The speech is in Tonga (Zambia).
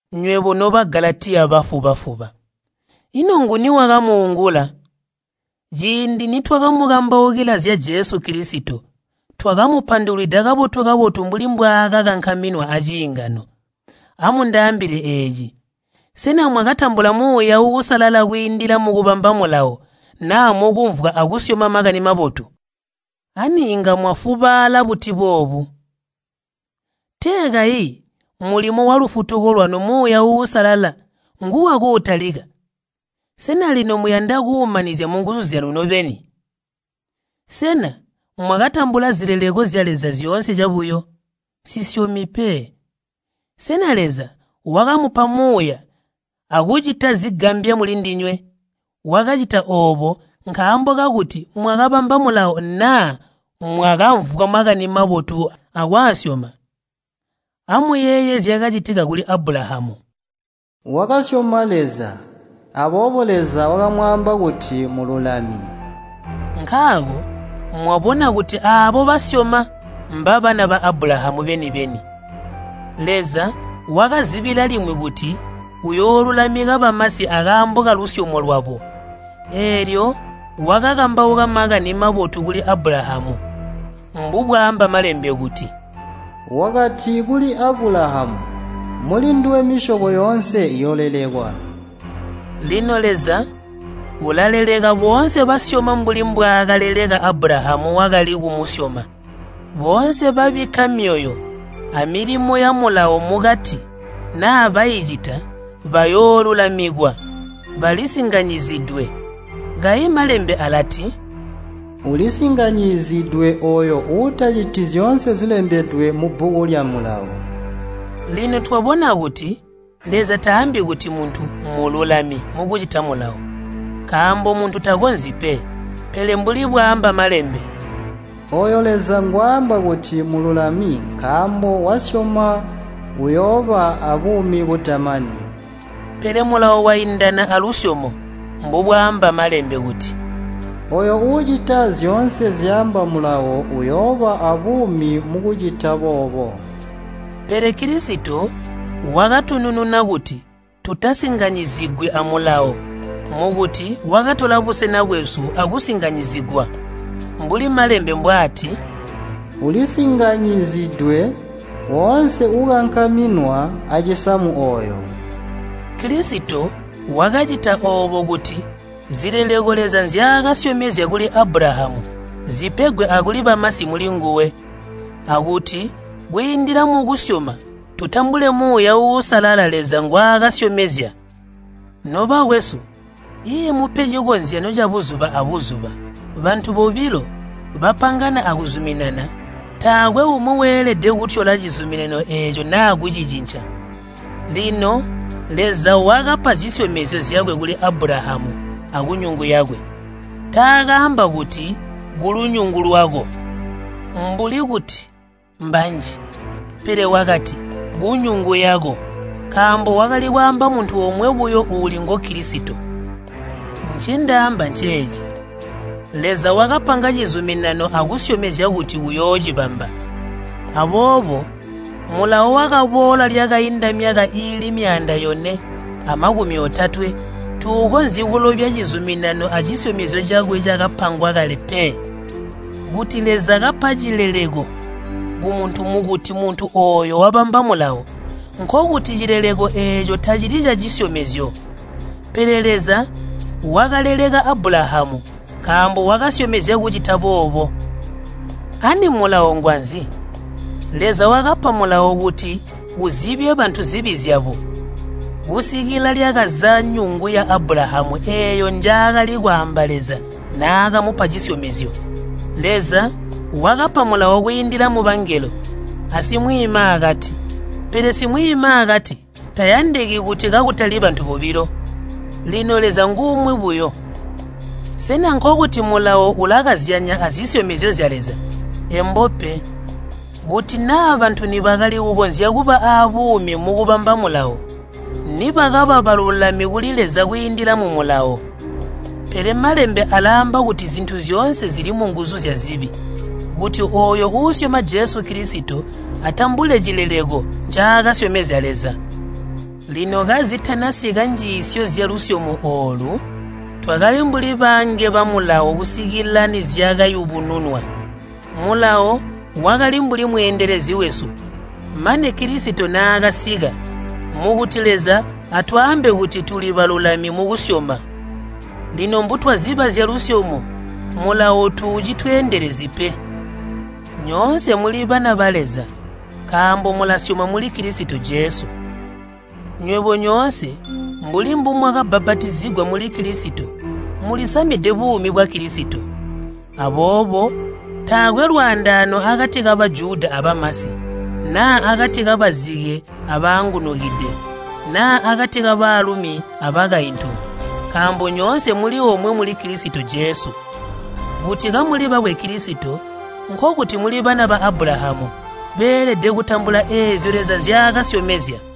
Nywebo no Bagalatiya bafuba-fuba! Ino nguni wakamuungula? Ciindi nitwakamukambaukila zya Jesu Kilisito, twakamupandulwida kabotu-kabotu mbuli mbwaakakankaminwa aciingano. Amundaambile eeci, sena mwakatambula Muuya Uusalala kwiindila mukubamba Mulawo naa mukumvwa akusyoma Makani Mabotu? Ani inga mwafubaala buti boobu? Tee kayi mulimo walufutuko lwanu Muuya Uusalala nguwakuutalika, sena lino muyanda kuumanizya mungu zyanu nobeni? Sena mwakatambula zileleko zya Leza zyoonse cabuyo? Nsisyomi pe. Sena Leza wakamupa Muuya akucita zigambya mulindinywe, wakacita oobo nkaambo kakuti mwakabamba Mulawo naa mwakamvwa Makani Mabotu akwaasyoma? Amuyeeye zyakacitika kuli Abulahamu. “Wakasyoma Leza, aboobo Leza wakamwaamba kuti mmululami.” Nkaako mwabona kuti aabo basyoma mbabana ba Abulahamu beni-beni. Leza wakazibila limwi kuti uyoolulamika bamasi akaambo kalusyomo lwabo. Eelyo wakakambauka Makani Mabotu kuli Abulahamu, mbubwaamba Malembe kuti, “Wakati kuli Abulahamu, ‘Mulinduwe misyobo yoonse iyoolelekwa.’” Lino Leza ulaleleka boonse basyoma mbuli mbwaakaleleka Abulahamu wakali kumusyoma. Boonse babikka myoyo amilimo ya Mulawo mukuti naa baicita bayoolulamikwa, balisinganyizidwe. Kayi Malembe alati, “Ulisinganyizidwe ooyo uutaciti zyoonse zilembedwe mubbuku lya Mulawo.” Lino twabona kuti Leza taambi kuti muntu mmululami mukucita Mulawo, nkaambo muntu takonzyi pe. Pele mbuli bwaamba Malembe, “Ooyo Leza ngwaamba kuti mmululami nkaambo wasyoma uyooba aabuumi butamani.” Pele Mulawo waindana alusyomo mbubwaamba Malembe kuti, “Ooyo uucita zyoonse zyaamba Mulawo uuyooba aabuumi mukucita boobo.” Pele Kilisito wakatunununa kuti tutasinganyizigwi a Mulawo mukuti wakatola busena bwesu akusinganyizigwa. Mbuli Malembe mbwaati, “Ulisinganyizidwe woonse uukankaminwa acisamu ooyo.” Kilisito wakacita oobo kuti zileleko Leza nzyaakasyomezya kuli Abulahamu zipegwe akuli bamasi mulinguwe, akuti kwiindila mukusyoma tutambule Muuya Uusalala Leza ngwaakasyomezya. Nobakwesu, iimupe cikozyanyo cabuzuba abuzuba. Bantu bobilo bapangana akuzuminana, taakwe umwi weelede kutyola cizuminano eeco naa kucicinca. Lino Leza wakapa zisyomezyo zyakwe kuli Abulahamu akunyungu yakwe. Takaamba kuti, “Kulunyungu lwako” mbuli kuti mbanji. Pele wakati, “Kunyungu yako,” nkaambo wakali kwaamba muntu omwe buyo uuli ngu Kilisito. Ncendaamba nceeci, Leza wakapanga cizuminano akusyomezya kuti uyoocibamba. Aboobo Mulawo wakaboola lyakainda myaka iili myaanda yone amakumi otatwe tuukonzyi kulobya cizuminano acisyomezyo cakwe cakapangwa kale pe. Kuti Leza kapa cileleko kumuntu mukuti muntuooyo wabamba Mulawo, nkokuti cileleko eeco tacili cacisyomezyo. Pele Leza wakaleleka Abulahamu nkaambo wakasyomezya kucita boobo. Ani Mulawo ngwanzi? Leza wakapa Mulawo kuti uzibye bantu zibi zyabo, kusikila lyakaza nyungu ya Abulahamu eeyo njaakali kwaamba Leza naakamupa cisyomezyo. Leza wakapa Mulawo kwiindila mubangelo asimwiimaakati. Pele simwiimaakati tayandiki kuti kakutali bantu bobilo. Lino Leza ngumwi buyo. Sena nkokuti Mulawo ulakazyanya azisyomezyo zya Leza? Embo pe! Kuti naa bantu nibakali kukonzya kuba aabuumi mukubamba Mulawo, nibakaba balulami kuli Leza kwiindila mu Mulawo. Pele Malembe alaamba kuti zintu zyoonse zili munguzu zyazibi, kuti ooyo uusyoma Jesu Kilisito atambule cileleko ncaakazyomezya Leza. Lino kazitanasika njiisyo zyalusyomo oolu, twakali mbuli baange ba Mulawo kusikila nizyakayubununwa. Mulawo wakali mbuli mweendelezi wesu mane Kilisito naakasika, mukuti Leza atwaambe kuti tuli balulami mukusyoma. Lino mbutwaziba zyalusyomo Mulawo tuucitweendelezyi pe. Nyoonse muli bana ba Leza nkaambo mulasyoma muli Kilisito Jesu. Nywebo nyoonse mbuli mbumwakabbapatizigwa muli Kilisito mulisamide buumi bwa Kilisito. Aboobo taakwe lwaandaano akati ka Bajuda abamasi, naa akati kabazike abaangunukide, naa akati kabaalumi abakaintu, nkaambo nyoonse muli omwe muli Kilisito Jesu. Kuti kamuli bakwe Kilisito, nkokuti muli bana ba Abulahamu, beelede kutambula eezyo Leza nzyaakasyomezya.